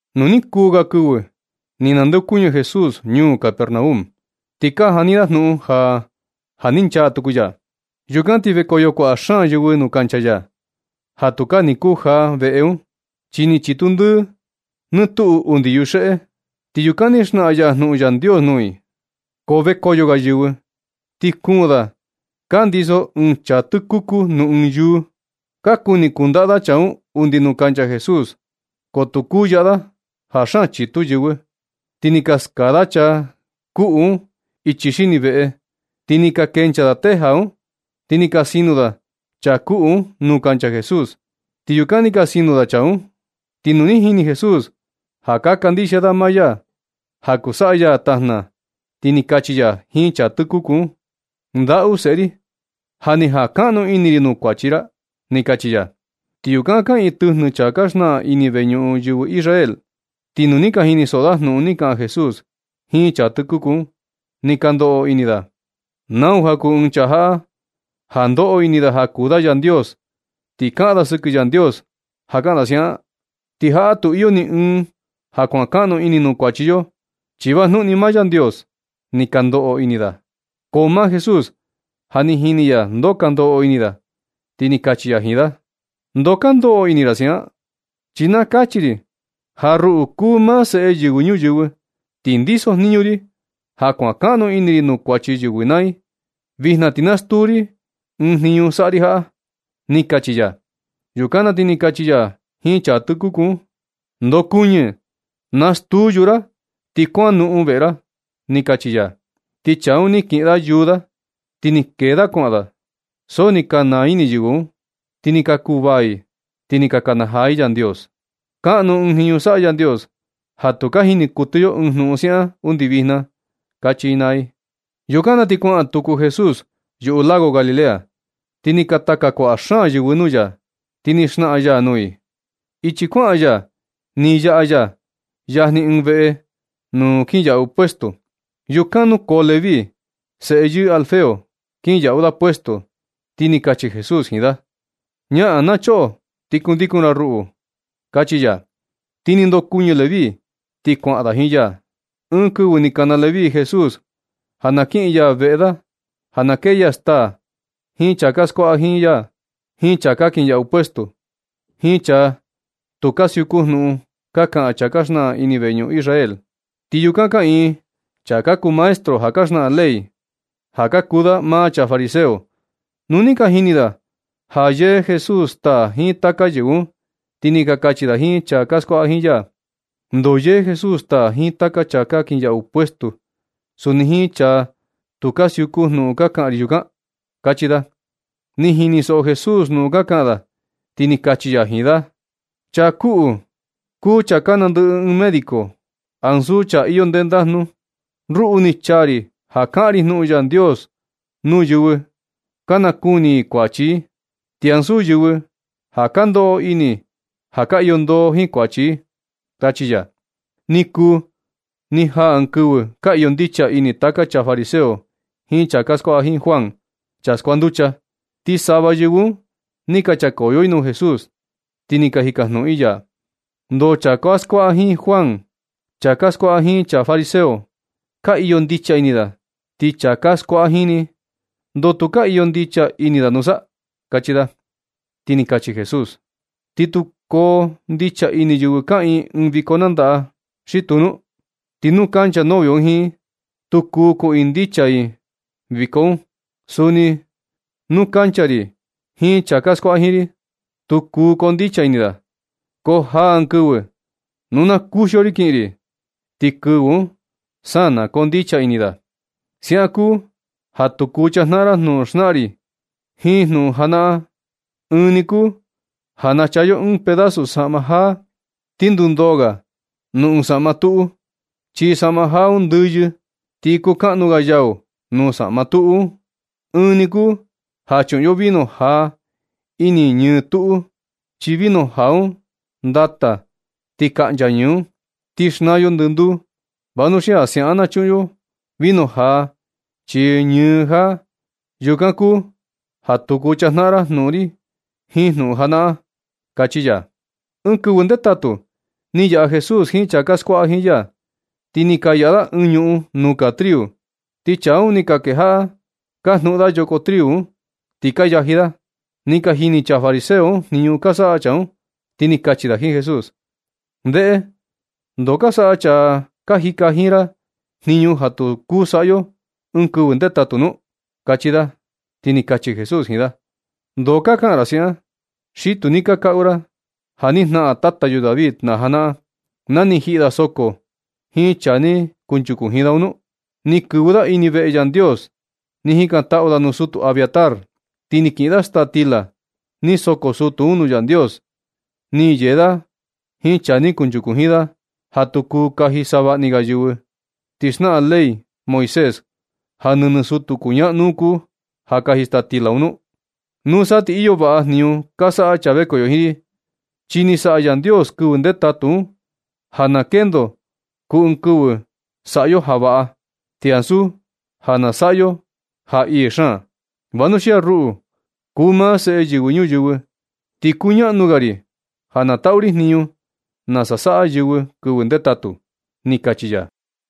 Nu ni kuu ga kɨvɨ ni nandeokuñɨ Jesús ñuu Capernaum. Ti ka jani da jnuꞌun ja, ja ni nchaa tuku ya. Yukan ti vekoyo kuaꞌa xaan yɨvɨ nuu kancha ya, ja tukaa ni kujaa veꞌe un, chi ni chitu ndɨɨ nɨ tuꞌu undi fuera. Ti yukan ni xnaꞌan ya jnuꞌun Yandios nuu i. Ko vekoyo ga yɨvɨ, ti kuun da ka ndiso ɨɨn chaa tɨkuku nuu ɨɨn yúú. Ka kuni kundaꞌa da chaa un undi nuu kancha Jesús, ko tu kuu yaꞌa da ja xaan chitu yɨvɨ. Ti ni ka skaa da chaa kuꞌu un ichi xini veꞌe. Ni ka kenchaa teja un, ti ni ka sino da chaa kuꞌu un nuu kancha Jesús, ti yukan ni ka sino da chaa un. Ti nu ni jini Jesús ja ka kandixia da maa ya ja kuu saꞌa ya tajna, ti ni kachi ya jiin chaa tɨkuku un: ―Ndaꞌu seꞌe ri, ja ni jankaꞌnu ini ri nuu kuachi ra ―ni kachi ya. Ti yukan kaꞌiin tɨjnɨ chaa ka xnaꞌan ini veñuꞌun yɨvɨ Israel. Ti nu ni ka jinisoꞌo da jnuꞌun ni kaꞌan Jesús jiin chaa tɨkuku un, ni ka ndoꞌo ini da: “¿Nau ja kuu ɨɨn chaa jaꞌa ja ndoꞌo ini da ja kuu da Yandios, ti kaꞌan da sɨkɨ Yandios ja kaꞌan da siaꞌan? Ti jaꞌa tu iyo ni ɨɨn ja kuankaꞌnu ini nuu kuachi yo, chi vajnuꞌun ni maa Yandios”, ni ka ndoꞌo ini da. Ko maa Jesús ja ni jini ya ndoo ka ndoꞌo ini da, ti ni kachi ya jiin da: ―¿Ndoo ka ndoꞌo ini ra siaꞌan? Chi na kachi ri ja ruꞌu kuu maa Seꞌe Yɨvɨ Ñuyɨvɨ, ti ndisojniñu ri ja kuankaꞌnu ini ri nuu kuachi yɨvɨ naa i. Vijna ti na stuu ri ɨɨn jniñu saꞌa ri jaꞌa ―ni kachi ya. Yukan na ti ni kachi ya jiin chaa tɨkuku un: ―Ndokunɨ, nastuu yúú ra, ti kuanoꞌon veꞌe ra ―ni kachi ya. Ti chaa un ni kiꞌin da yúú da, ti ni kee da kuaꞌan da. So ni ka naa ini yɨvɨ un, ti ni kuvaa i ni ka nakanajaa i Yandios: ―¡Kaꞌnu ɨɨn jniñu saꞌa Yandios ja tu ka jini kuɨtɨ yo ɨɨn jnuꞌun siaꞌan undi vijna! ―kachi i naa i. Yukan na ti kuaꞌan tuku Jesús yuꞌu lago Galilea, ti ni ka taka kuaꞌa xaan yɨvɨ nuu ya. Ti ni xnaꞌan ya nuu i. Ichi kuaꞌan ya ni yaꞌa ya yajni ɨɨn oficina nuu kinyaꞌu puesto. Yukan nukoo Leví, seꞌe yɨɨ Alfeo, kinyaꞌu da puesto. Ti ni kachi Jesús jiin da: ―Ñaꞌan na choꞌo, ti kundikun ra ruꞌu ―kachi ya. Ti ni ndokuɨñɨ Leví, ti kuaꞌan da jiin ya. Ɨɨn kɨvɨ ni kana Leví Jesús ja na kiꞌin ya veꞌe da ja na kee ya staa jiin chaa ka skuaꞌa jiin ya, jiin chaa ka kinyaꞌu puesto, jiin chaa tu ka siuku jnuꞌun ka kaꞌan chaa ka xnaꞌan ini veñuꞌun Israel. Ti yukan kaꞌiin chaa ka kuu maestro ja ka xnaꞌan ley, ka kuu da maa chaa fariseo. Nu ni ka jini da ja yee Jesús staa jiin taka yɨvɨ un, ti ni ka kachi da jiin chaa ka skuaꞌa jiin ya: ―¿Ndoo yee Jesús staa jiin taka chaa ka kinyaꞌu puesto, suni jiin chaa tu ka siuku jnuꞌun ka kaꞌan ri yukan? ―kachi da. Ni jinisoꞌo Jesús jnuꞌun ka kaꞌan da, ti ni kachi ya jiin da: ―Chaa kuꞌu kuu chaa nandɨꞌɨ ɨɨn médico, ansu chaa iyo ndendajnu. Ruꞌu ni chaa ri ja kaꞌan ri jnuꞌun Yandios nuu yɨvɨ ka nakuni i kuachi i, ti ansu yɨvɨ ka ndoꞌo ini ja ka iyo ndoo jiin kuachi i ―kachi ya. Ni kuu ja ni jaa ɨɨn kɨvɨ ka iyo ndicha ini taka chaa fariseo jiin chaa ka skuaꞌa jiin Juan, chaa skuanducha. Ti sava yɨvɨ un ni ka chakoyo i nuu Jesús, ti ni ka jikajnuꞌun i ya: ―¿Ndoo chaa ka skuaꞌa jiin Juan jiin chaa ka skuaꞌa jiin chaa fariseo, ka iyo ndicha ini da, ti chaa ka skuaꞌa jiin ni, ndoo tu ka iyo ndicha ini da nusa? ―kachi da. Ti ni kachi Jesús: ―¿Ti kuu koo ndicha ini yɨvɨ kaꞌiin ɨɨn viko nandaꞌa xi tuu nu? Ti nu kancha novio un jiin i, tu kuu kuꞌiin ndicha i viko un. Suni nu kancha ri jiin chaa ka skuaꞌa jiin ri, tu kuu koo ndicha ini da. Ko jaa ɨɨn kɨvɨ nu na kuxio ri kiꞌin ri, ti kɨvɨ un sa na koo ndicha ini da. Siaꞌan kuu ja tu kuu chajnaꞌan ra jnuꞌun xnaꞌan ri jiin jnuꞌun janaꞌan. Ɨɨn ni kuu ja nachaa yo ɨɨn pedazo saꞌma jaa, ti ndundoo ga nuu ɨɨn saꞌma tuꞌu. Chi saꞌma jaa un ndɨyɨ, ti kuu kaꞌnu ga yau nuu saꞌma tuꞌu un. Ɨɨn ni kuu ja chuꞌun yo vino jaa ini ñɨɨ tuꞌu, chi vino jaa un ndata ti kaꞌncha ñɨɨ un, ti xnaa yo ndɨnduu. Vanuxia siaꞌan ja chuꞌun yo vino jaa chii ñɨɨ jaa. Yukan kuu ja tu kuu chajnaꞌan ra jnuꞌun ri jiin jnuꞌun janaꞌan―kachi ya. Ɨɨn kɨvɨ ndetatu ni yaꞌa Jesús jiin chaa ka skuaꞌa jiin ya, ti ni ka yaꞌa da ɨɨn ñuꞌun nuu kaa triu. Ti chaa un ni ka kejaꞌa ka jnuꞌun da yoko triu un, ti ka yaji da. Ni ka jini chaa fariseo un jniñu ka saꞌa chaa un, ti ni ka kachi da jiin Jesús: ―Ndeꞌe, ¿ndoo ka saꞌa chaa ka jika jiin ra jniñu ja tu kuu saꞌa yo ɨɨn kɨvɨ ndetatu nu? ―kachi da. Ti ni kachi Jesús jiin da: ―¿Ndoo ka kaꞌan ra siaꞌan, xi tu ni ka kaꞌu ra ja ni jnaꞌan tata yo David na janaꞌan, na ni jiꞌi da soko jiin chaa ni kunchuku jiin da un nu? Ni kɨvɨ da ini veꞌe Yandios, ni jikantaꞌu da nuu sutu Abiatar, ti ni kiꞌin da staa stila ni soko sutu un nuu Yandios. Ni yee da jiin chaa ni kunchuku jiin da, ja tu kuu kaji savaꞌni ga yɨvɨ, ti xnaꞌan ley Moisés ja nɨnɨ sutu kuñaꞌnu kuu, ja kaji staa stila un. Nusa ti iyo vaꞌa jniñu ka saꞌa chaa vekoyo jiin ri. Chi ni saꞌa Yandios kɨvɨ ndetatu un ja na kendo kuu ɨɨn kɨvɨ saꞌa yo ja vaꞌa, ti ansu ja na saꞌa yo ja ii xaan. Vanuxia ruꞌu kuu maa Seꞌe Yɨvɨ Ñuyɨvɨ, ti kuñaꞌnu ga ri ja na taꞌu ri jniñu nasa saꞌa yɨvɨ kɨvɨ ndetatu ―ni kachi ya.